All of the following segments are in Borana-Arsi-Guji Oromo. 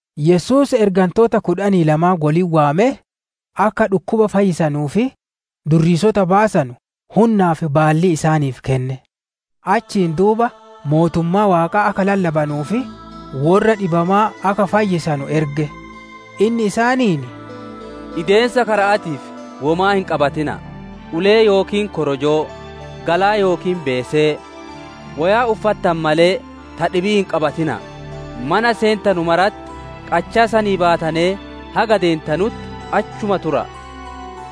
Yesuus ergantoota kudhanii lamaan wolitti waamee, akka dhukkuba fayyisanuu fi durriisota baasanu hunnaa fi baallii isaaniif kenne. Achiin duuba mootummaa Waaqaa akka lallabanuu fi worra dhibamaa akka fayyisanu erge. Inni isaaniin, «Ideemiisa kara'aatiif womaa hin qabatina'a: ulee yookiin korojoo, galaa yookiin beesee, woyaa uffattane malee ta dhibii hin qabatina'a. Mana seentanu maratti, qachaa sanii baatanee haga deentanutti achuma tura'a.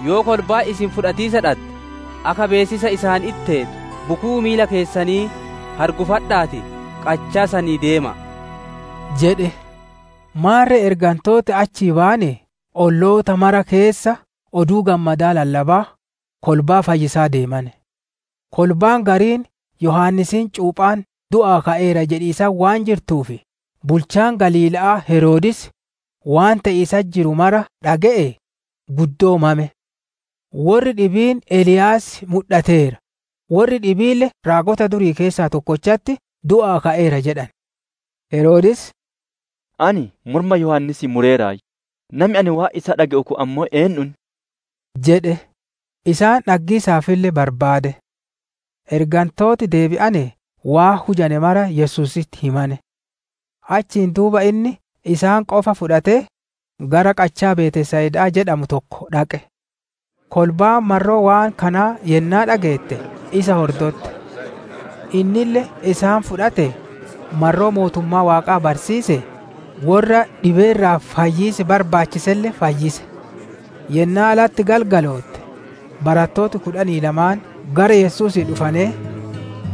Yoo kolbaan isin fudhatiisa dhadde, akka beessisa isaanitti teetu bukuu miila keessanii hargufadha'aatii qachaa sanii deema'a» jedhe. Maarre ergantooti achii bayanee olloota maraa keessa Oduu Gammadaa lallabaa, kolbaa fayyisaa deemane. Kolbaan gariin Yohaannisiin Cuuphaan du'aa ka'eera jedhiisatti waan jirtuuf, bulchaan Galiila'aa Heroodis, waan te'iisatti jiru mara dhage'ee, guddoo mame. Worri dhibiin Eliyaas mudhateera, worri dhibiille raagota durii keessaa tokkochatti du'aa ka'eera jedhane. Heroodis, «Ani morma Yohaannisii mureeraayyu; nami ani waan isaa dhage'u kun ammoo eennu inni?» jedhe. Isa dhaggiisaafille barbaade. Ergantooti deebi'anee waan hujane mara Yesuusitti himane. Achiin duuba inni isaan qofa fudhatee, gara qachaa Betsayidaa jedhamuu tokko dhaqe. Kolbaan marroo waan kanaa yennaa dhageette, isa hordotte. Innille isaan fudhatee, marroo mootummaa Waaqaa barsiisee, worra dhibee irraa fayyiisi barbaachiselle fayyise. Yennaa latti galgalootte, barattooti kudhanii lamaan gara Yesuusii dhufanee,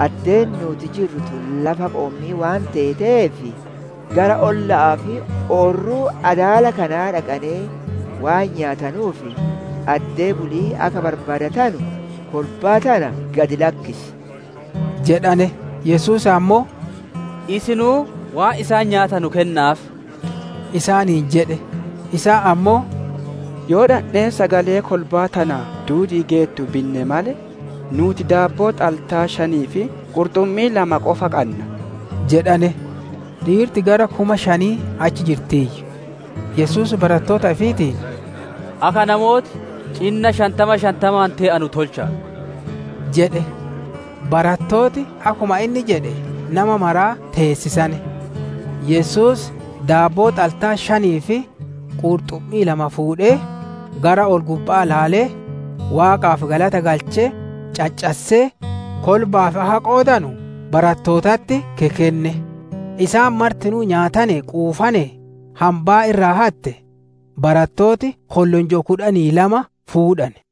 «Addeen nuuti jirru tun lafa qoommii waan teeteef, gara olla'aa fi oorruu adaala kanaa dhaqanee waan nyaatanuu fi addee buli'ii akka barbaadatanu kolbaa tana gad lakkisi» jedhane. Yesuus ammoo, «Isinuu waan isaan nyaatanu kenna'aaf» isaaniin jedhe. Isaan ammoo, «Yoo dhandhee sagalee kolbaa tana duudi'iif geettu binne malee, nuuti daabboo xaltaa shanii fi qurxummii lama qofa qanna» jedhane. Dhiirti gara kuma shanii achi jirtiiyyu. Yesuus barattoota ifiitiin, «Akka namooti cinna shantama shantamaan tee'anu tolcha'a» jedhe. Barattooti akkuma inni jedhe nama maraa teessisane. Yesuus daabboo xaltaa shanii fi qurxummii lama fuudhee, gara ol-gubba'aa ilaalee, Waaqaaf galata galchee, caccassee, kolba'aaf akka qoodanu barattootatti kekenne. Isaan martinuu nyaatanee quufanee, hambaa irraa hatte barattooti kollonjoo kudhanii lama fuudhane.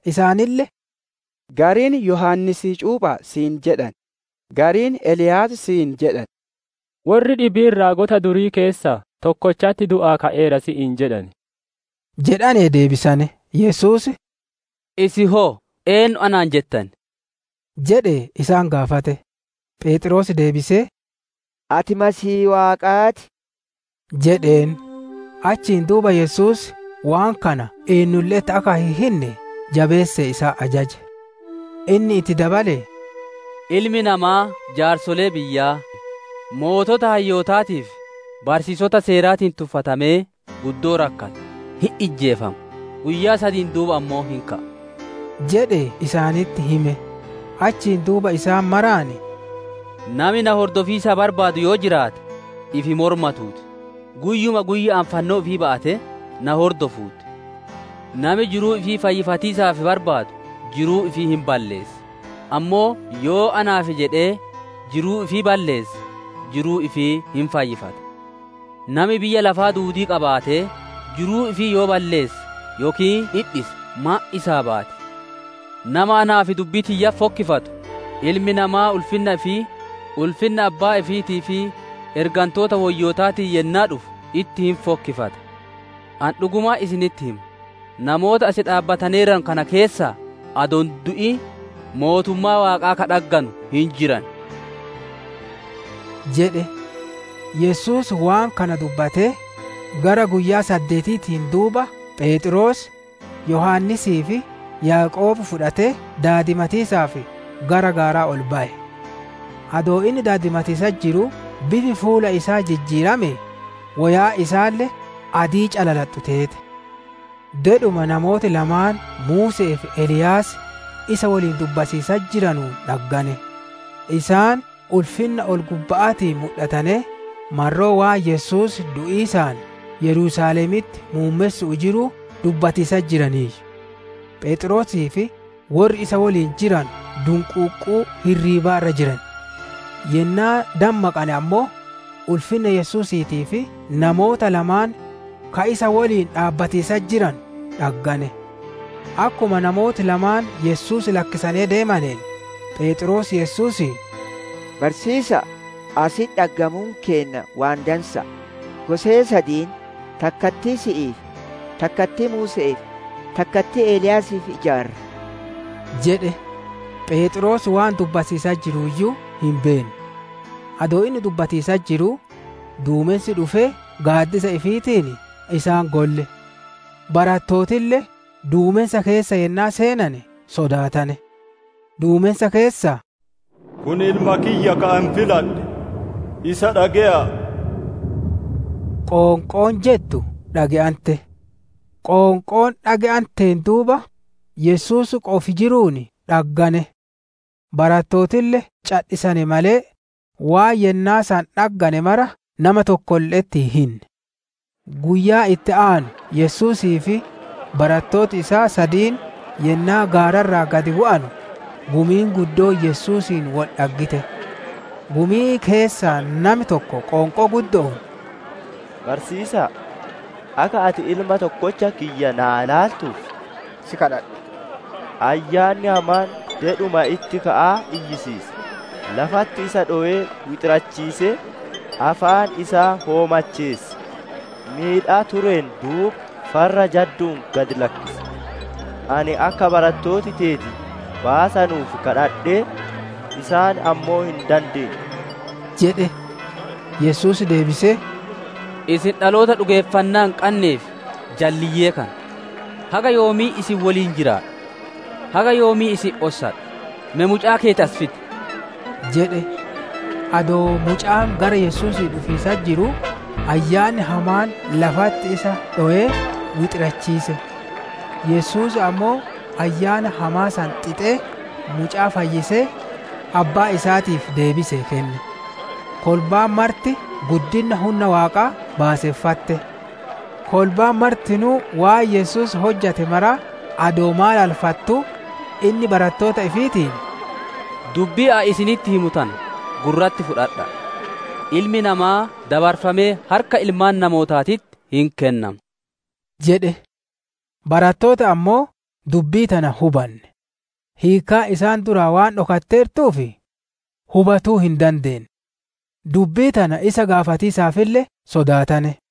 Isaanille, «Gariin Yohaannisii cuupha'a si'iin jedhan; gariin Eliyaas si'iin jedhan; worri dhibiin raagota durii keessaa tokkochatti du'aa ka'eera si'iin jedhan» jedhanee deebisane. Yesuus, «Isin hoo eennu anaan jettan?» jedhee isaan gaafate. Pheexroos deebisee, «Ati Masiihii Waaqaa ti» jedheen. Achiin duuba Yesuus waan kana eennulle'etti akka hin hinne jabeessee isaan ajaje. Inni itti dabalee, «Ilmi namaa jaarsolee biyyaa, sooreyyii hayyootaatii fi barsiisota seeraatiin tuffatamee guddoo rakkata, hin ijjeefama, guyyaa sadiin duuba ammoo hin ka'a» jedhee isaanitti hime. Achiin duuba isaan maraan, «Nami na hordofiisaa barbaadu yoo jiraate, ifi mormatuu ti, guyyuma guyya'aan fannoo ifii ba'atee, na hordofuu ti. Nami jiruu ifii fayyifatiisaaf barbaadu jiruu ifii hin balleessa, ammoo yoo naaf jedhee jiruu ifii balleesse jiruu ifii hin fayyifata. Nami biyya lafaa duudii qabaatee jiruu ifii yoo balleesse yookiin dhidhise maan isaa baati? Nama anaa fi dubbii tiyyatti fokkifatu, Ilmi Namaa ulfinna ifii, ulfinna abbaa ifiitii fi ergantoota woyyootaatiin yennaa dhufu itti hin fokkifata. Ani dhugumaan isinitti hima, namoota as dhaabbataneeranu kana keessaa adoo hin du'in, Mootummaa Waaqaa ka dhagganu hin jiran» jedhe. Yesuus waan kana dubbatee, gara guyyaa saddeetiitiin duuba Pheexroos, Yohaannisii fi Yaaqoob fudhatee daadimatiisaaf gara gaaraa ol baye. Adoo inni daadimatiisatti jiruu bifi fuula isaa jijjiiramee woyaan isaalle adii calalaxxu teete. Dedhuma namooti lamaan Muuse'ee fi Eliyaas isa woliin dubbatiisatti jiranuun dhaggane. Isaan ulfinna ol-gubba'aatiin mudhatanee marroo waan Yesuus du'iisaan Yerusaalemitti muummessu'uu jiruu dubbatiisatti jiraniiyyu. Pheexroosii fi worri isa woliin jiranu dunquuqquu hirriiba irra jiran; yennaa dammaqane ammoo ulfinna Yesuusiitii fi namoota lamaan ka isa woliin dhaabbatiisatti jiranu dhaggane. Akkuma namooti lamaan Yesuus lakkisanee deemaneen, Pheexroos Yesuusiin, «Barsiisa'a! Asitti dhaggamuun keenna waan dansa'a; gosee sadiin, takkattii si'iif, takkattii Muuse'eef, takkattii Eliyaasiif ijaarra» jedhe; Pheexroos waan dubbatiisatti jiruuyyuu hin beenne. Adoo inni dubbatiisatti jiruu, duumensi dhufee gaaddisa ifiitiin isaan golle; barattootille duumensa keessa yennaa seenane sodaatane. Duumensa keessaa, «Kun Ilma kiyya, ka ani filadhe; isa dhage'aa!» qoonqoon jettu dhage'ante. Qoonqoon dhage'anteen duuba, Yesuus qofi jiruun dhaggane. Barattootille cadhisane malee, waan yennaa san dhaggane mara nama tokkolle'etti hin hinne. Guyyaa itti aanu Yesuusii fi barattooti isaa sadiin yennaa gaara irraa gad bu'anu, gumiin guddoon Yesuusiin wol dhaggite. Gumii keessaa nami tokko qoonqoo guddo'oon, «Barsiisa'a! Akka ati ilma tokkocha kiyya naa laaltuuf, si kadhadha. Ayyaanni hamaan dedhuma itti ka'aa iyyisiisa, lafatti isa dhowee wixirachiisee, afaan isa hoomacheessa; miidhaa tureen duuba farra jaddu'uun gad lakkisa. Ani akka barattooti teeti baasanuuf kadhadhe; isaan ammoo hin dandeenne» jedhe. Yesuus deebisee, «Isin dhaloota dhugeeffannaa hin qannee fi jalliyyee kana! Haga yoomii isin woliin jiraadha? Haga yoomii isin ossadha? Me mucaa keeti as fidi» jedhe. Adoo mucaan gara Yesuusii dhufiisatti jiruu, ayyaanni hamaan lafatti isa dhowee wixirachiise. Yesuus ammoo ayyaana hamaa san xixee, mucaa fayyisee, abbaa isaatiif deebisee kenne. Kolbaan marti guddinna hunna Waaqaa baaseffatte. Kolbaan martinuu waan Yesuus hojjate maraa adoo maalalfattuu, inni barattoota ifiitiin, «Dubbii ani isinitti himu tana gurratti fudhadha'a! Ilmi namaa dabarfamee harka ilmaan namootaatitti hin kennama» jedhe. Barattooti ammoo dubbii tana hin hubanne. Hiikkaan isaan duraa waan dhokatteertuuf hubatuu hin dandeenne; dubbii tana isa gaafatiisalle sodaatane.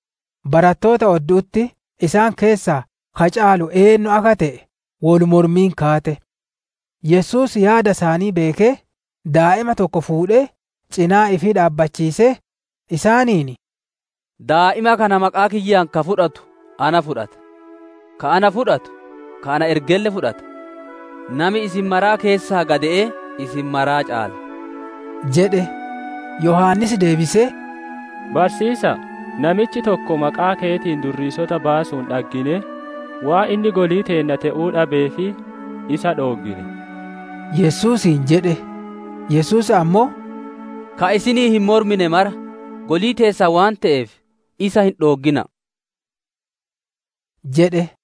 Barattoota oddu'utti isaan keessaa ka caalu eennu akka te'e wol mormiin kaate. Yesuus yaada isaanii beekee, daa'ima tokko fuudhee, cinaa ifii dhaabbachiisee, isaaniin, «Daa'ima kana maqaa kiyyaan ka fudhatu na fudhata; ka ana fudhatu, ka na ergelle fudhata. Nami isin maraa keessaa gade'ee isin maraa caala» jedhe. Yohaannis deebisee, «Barsiisa'a, namichi tokko maqaa keetiin durriisota baasuun dhagginee, waan inni golii teenna te'uu dhabeef, isa dhooggine» Yesuusiin jedhe. Yesuus ammoo, «Ka isiniin hin mormine mara golii teessan waan te'eef, isa hin dhooggina'a!» jedhe.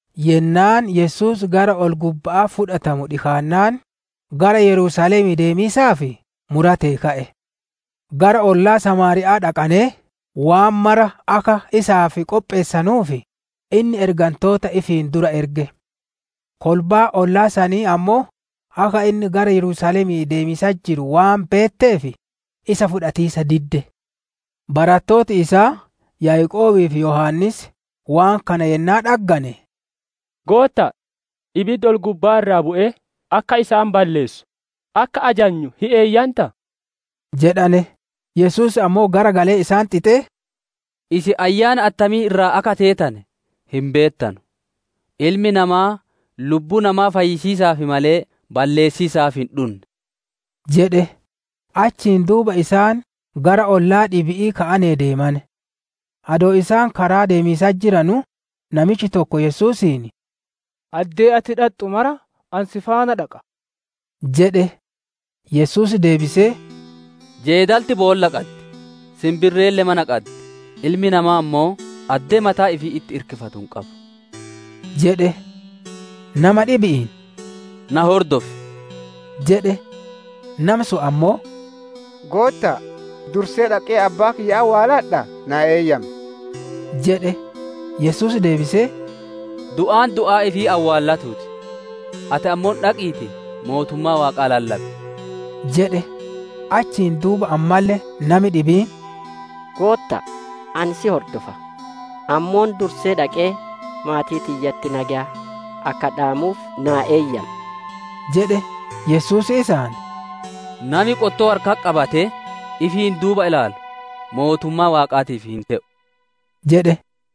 Yennaan Yesuus gara ol-gubba'aa fudhatamu dhikaannaan, gara Yerusaalemii deemiisaaf muratee ka'e. Gara ollaa Samaariya'aa dhaqanee waan mara akka isaaf qopheessanuuf, inni ergantoota ifiin dura erge. Kolbaan ollaa sanii ammoo akka inni gara Yerusaalemii deemiisatti jiru waan beetteef, isa fudhatiisa didde. Barattooti isaa Yaaqoobii fi Yohaannis waan kana yennaa dhaggane, «Gootta'a, ibiddi ol-gubbaa irraa bu'ee akka isaan balleessu akka ajanyu hin eeyyantaa?» jedhane. Yesuus ammoo garagalee isaan xixee, [ «Isin ayyaana attamii irraa akka teetane hin beettanu; Ilmi Namaa lubbuu namaa fayyisiisaaf malee balleessiisaaf hin dhunne»] jedhe. Achiin duuba isaan gara ollaa dhibi'ii ka'anee deemane. Adoo isaan karaa ideemiisatti jiranuu, namichi tokko Yesuusiin, «Addee ati dhaxxu mara ani si faana dhaqa» jedhe. Yesuus deebisee, «Jeedalti boolla qaddi; sinbirreelle mana qaddi; Ilmi namaa ammoo addee mataa ifii itti irkifatu hin qabu» jedhe. Nama dhibi'iin, «Na hordofi» jedhe. Nami sun ammoo, «Goottaa, dursee dhaqee abbaa kiyya awwaaladha naa eeyyam» jedhe. Yesuus deebisee, «Du'aan du'aa ifii awwaalatuu ti. Ati ammoo dhaqiitii mootummaa Waaqaa lallabi» jedhe. Achiin duuba ammalle nami dhibiin, «Gootta'a, ani si hordofa; ammoo dursee dhaqee maatii tiyyaatii nageya akka dhaamuuf naa eeyyami» jedhe. Yesuus isaan, «Nami qottoo harkatti qabatee, ifiin duuba ilaalu mootummaa Waaqaatiif hin te'u» jedhe.